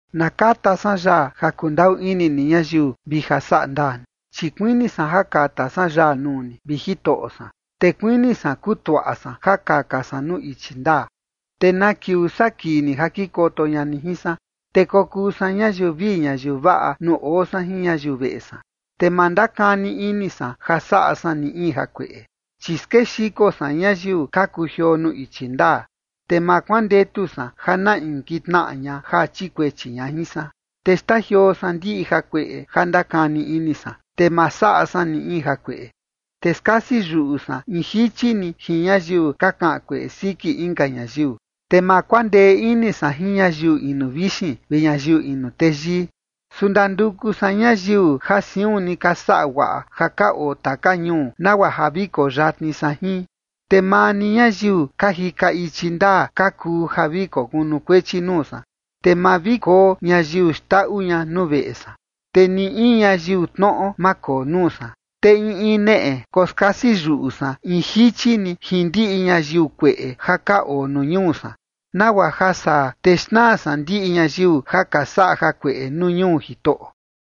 Na kata san yaa ja kundaꞌu ini ni ñayiu vi ja saꞌa ndaa ni, chi kuini san ja kata san yaa nuu ni, vi Jitoꞌo san. Te kuini san kutuaꞌa san ja kaka san nuu ichi ndaa. ¿Te na kiuu saa kii ni ja kikoto ña ni jin san? Te kokuu san ñayiu vii ñayiu vaꞌa nuu oo san jin ñayiu veꞌe san. Te ma ndakani ini san ja saꞌa san ni in jakueꞌe. Chi skexiko san ñayiu ka kujioo nuu ichi ndaa, te ma kuandetu san ja na in kitnaꞌa ña ja chikuechi ña jin san. Te xtajioo san ndiꞌi jakueꞌe ja ndakani ini san, te ma saꞌa san ni in jakueꞌe. Te skasi yuꞌu san in jichi ni jin ñayiu ka kaꞌan kueꞌe siki inka ñayiu, te ma kuandee ini san jin ñayiu inu vixin vi ñayiu inu teyii. Su ndanduku san ñayiu ja siun ni ka saꞌa guaꞌa ja ka oo taka ñuu, nagua ja vi koo yatni san jin. Te maa ni ñayiu ka jika ichi ndaa ka kuu ja vi kokunukuechi nuu san. Te ma vi koo ñayiu xndaꞌu ña nuu veꞌe san, te ni in ñayiu tnoꞌo, ma koo nuu san. Te in in neꞌe koskasi yuꞌu san in jichi ni jin ndiꞌi ñayiu kueꞌe ja ka oo nuu ñuu san, nagua ja saa te xnaa san ndiꞌi ñayiu ja ka saꞌa jakueꞌe nuu ñuu Jitoꞌo.